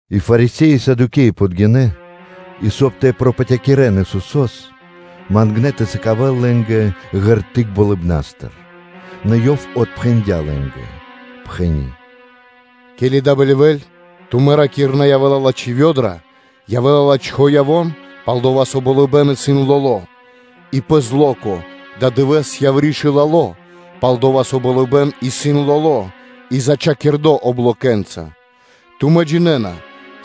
И Фарисе́и и Садукеи подгинэ́, и, соб (кай) тэ пропатякирэн Исусо́с, палдава́ ёнэ мангнэ́ тэ сыкавэ́л лэ́нгэ ґерты́к (знаме́ниё) болыбна́стыр. Нэ, Ёв отпхэндя́ лэ́нгэ, пхэни́: “Ке́ли да бэльвэ́ль, тумэ́ ракирэ́на, ‘Явэ́ла лачхи́ вэдра (погода), пал-дова́ со болыбэ́н исын лоло́;’ и пэ зло́ко: ‘Ададывэ́с яври́ исын вихура, пал-дова́ со болыбэ́н исын лоло́ и зачхакирдо облокэ́нца.’ Тумэ́ джинэ́на,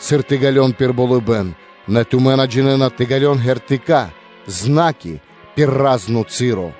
сыр тэ ґалён пир болыбэ́н, нэ тумэ́ на джинэ́на тэ ґалён ґертыка́ (знаме́нии) пир разно часо.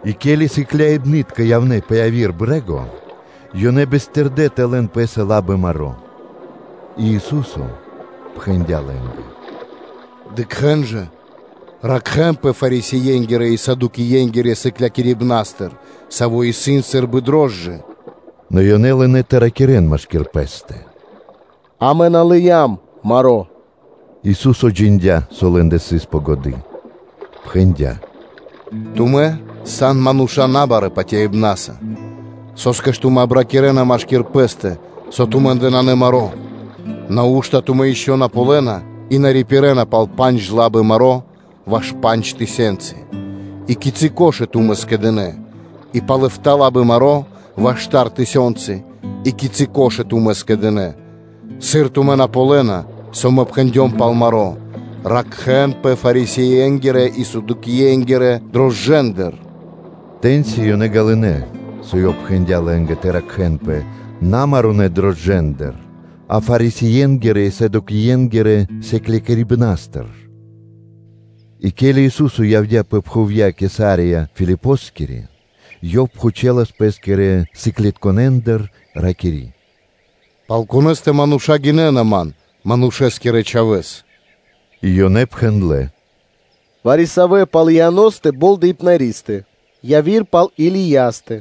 И ке́ли сыкляибны́тка явнэ́ пэ яви́р брэ́го, ёнэ бистырдэ тэ лэн пэ́са лабы маро́. И Ису́со пхэндя́ лэ́нгэ: “Дыкхэ́н жа, ракхэ́нпэ Фарисее́нгирэ и Садукеенгирэ сыклякирибнастыр, саво́ исын сы́рбы рошчына (закваска).” Нэ ёнэ лынэ́ тэ пириракирэн машки́р пэ́стэ: “Амэ на лыям лабы маро́.” Ису́со джиндя́, со лэ́ндэ сыс пэ годы́, пхэндя́: “Тумэ́ сан мануша́ на барэ́ патяибна́са, со́скэ ж тумэ́ обракирэна машки́р пэ́стэ, со тумэ́ндэ нанэ маро́? Нау́што тумэ́ ишчо (инкэ́) на ґалёна и на рипирэна пал пандж лабы маро́ ваш пандж тысёнцы, и кицы́ кхудэ́ тумэ́ скэдынэ́? И пал эфта́ (битринэ́нгиро дэш) лабы маро́ ваш штар тысёнцы, и кицы́ кхудэ́ тумэ́ скэдынэ́? Сыр тумэ́ на ґалёна, со Мэ пхэндём на пал маро́: ‘Ракхэ́нпэ Фарисее́нгирэ и Садукеенгирэ рошчынатыр?’” Тэ́ньци ёнэ ґалынэ́, со Ёв пхэндя́ лэ́нгэ тэ ракхэ́нпэ на марунэ рошчынатыр, а Фарисее́нгирэ и Садукеенгирэ сыклякирибнастыр. И ке́ли Ису́со явдя́ пэ пхувья́ Кесария Филипоскири, Ёв пхучэлас Пэ́скирэ сыклытконэндыр, ракири́: “Пал Конэ́стэ мануша́ гинэ́на Ман, Манушэ́скирэ Чхавэ́с?” И ёнэ пхэндлэ́: “Вари-савэ́ пал Ианостэ Болдэипнаристэ, яви́р пал Илиястэ,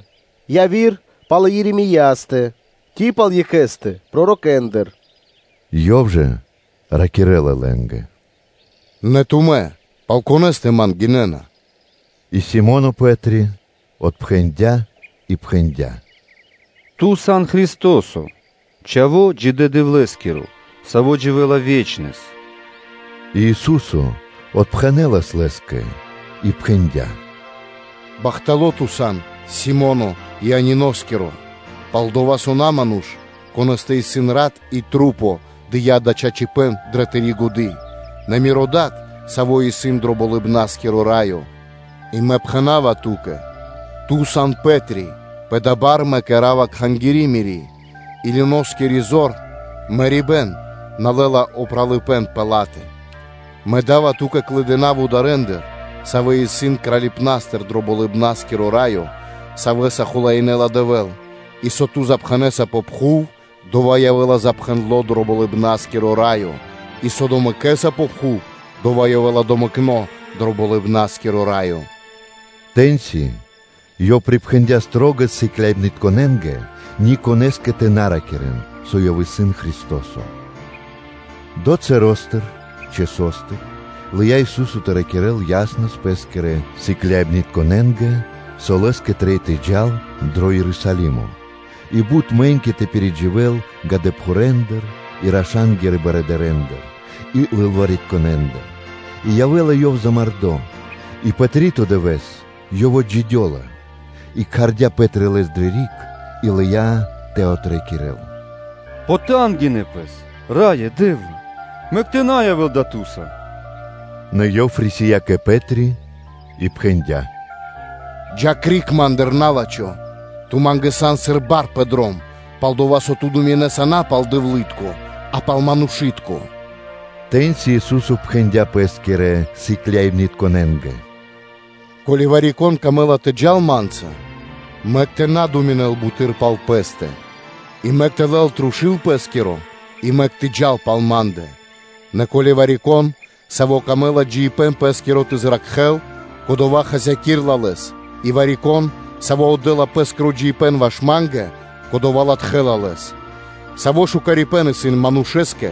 яви́р пал Еремеёстэ ци пал екхэ́стэ пророкэндыр” Ёв жа ракирэ́ла лэ́нгэ: “Нэ тумэ́ пал конэ́стэ Ман гинэ́на?” И Си́моно Пэ́три отпхэндя́ и пхэндя́: “Ту сан Христо́со, Чхаво́ Джидэ́ Дэвлэ́скиро, Саво́ дживэ́ла ве́чнэс” И Ису́со отпхэнэ́лас лэ́скэ и пхэндя́: “Бахтало́ ту сан, Си́моно Иониноскиро, пал-дова́ со на ману́ш, конэ́стэ исын рат и маса́, дыя́ дава́ чачипэ́н дрэ тыри́ годы́, нэ Миро Дад, Саво́ исын дро Болыбна́скиро Раё. И Мэ пхэна́ва ту́кэ: Ту сан Пэ́три, пэ дава́ бар Мэ кэра́ва Кхангири́ Мири́, и люноскири зор (мэрибэ́н) на лэ́ла упралыпэ́н пэ ла́тэ. Мэ да́ва ту́кэ клыдына вударэндыр, савэ́ исын Кралипнастыр дро Болыбна́скиро Раё, Савэ́са хулаинэла Дэвэ́л; и со ту запхэнэса пэ пхув, дова́ явэ́ла запхэндло дро Болыбна́скиро Раё, и со домэкэса пэ пхув, дова́ явэ́ла домэкно дро Болыбна́скиро Раё.’” Тэ́ньци Ёв припхэндя́ шылалэс сыкляибнытконэ́нгэ ни конэ́скэ тэ на ракирэ́н, со Ёв исын Христо́со. Долэ́ часостыр лыя́ Ису́со тэ ракирэ́л яснэс Лэ́скирэ сыкляибнытконэ́нгэ, со Лэ́скэ трэй тэ джал дро Ерусалимо и бут мэ́ньки тэ пиридживэл годэпхурэндыр и рашангирэндыр и лылваритконэндыр, и явэ́ла Ёв замардо, и пэ три́то дывэ́с Ёв отджидёла. И кхардя́ Пэ́три Лэс дрэ риг, и лыя́ тэ отракирэл: “Потангинэ Пэс, Раё Дэ́вла! Мэк тэ на явэ́л дава́ Ту́са.” Нэ Ёв рисия́ кэ Пэ́три и пхэндя́: “Джа́ криг Ма́ндыр, на́лачхо; ту Ма́нгэ сан, сыр бар пэ дром, пал-дова́ со ту думинэса на пал Дэвлы́тко, а пал манушы́тко.” Тэ́ньци Ису́со пхэндя́ Пэ́скирэ сыкляибнытконэ́нгэ: “Ко́ли вари-конэ́скэ пир ило́ тэ джал Ма́нца, мэк тэ на думинэл буты́р пал пэ́стэ, и мэк тэ лэл трушу́л пэ́скиро, и мэк тэ джал пал Ма́ндэ.” Нэ ко́ли вари-кон, савэ́скэ исын дро́го джиибэ́н пэ́скиро тэ зракхэ́л, кодова́ хасякирэ́ла лэс, и вари-кон, саво́ отдэ́ла пэ́скиро джиибэ́н ваш Ма́нгэ, кодова́ латхэ́ла Лэс. Саво́ лачхипэ́н исын манушэ́скэ,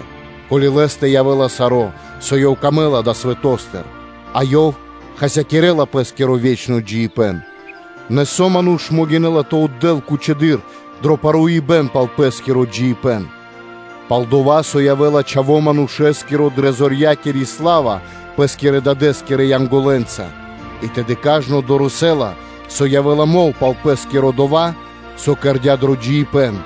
ко́ли лэ́стэ явэ́ла саро́, со лэ́скэ трэй далэ́ свэто́стыр, а ёв хасякирэ́ла пэ́скиро ве́чно джиибэ́н? Нэ со ману́ш могинэ́ла тэ отдэ́л кучэдыр дро паруибэн пал пэ́скиро джиибэ́н? Пал-дова́ со явэ́ла Чхаво́ Манушэ́скиро дрэ зорьякири сла́ва Пэ́скирэ Дадэ́скирэ Янголэнца, и тэды кажно (сва́ко) дорэсэ́ла, со явэ́ла мол пал пэ́скиро дова́, со кэрдя́ ёв дро джиибэ́н.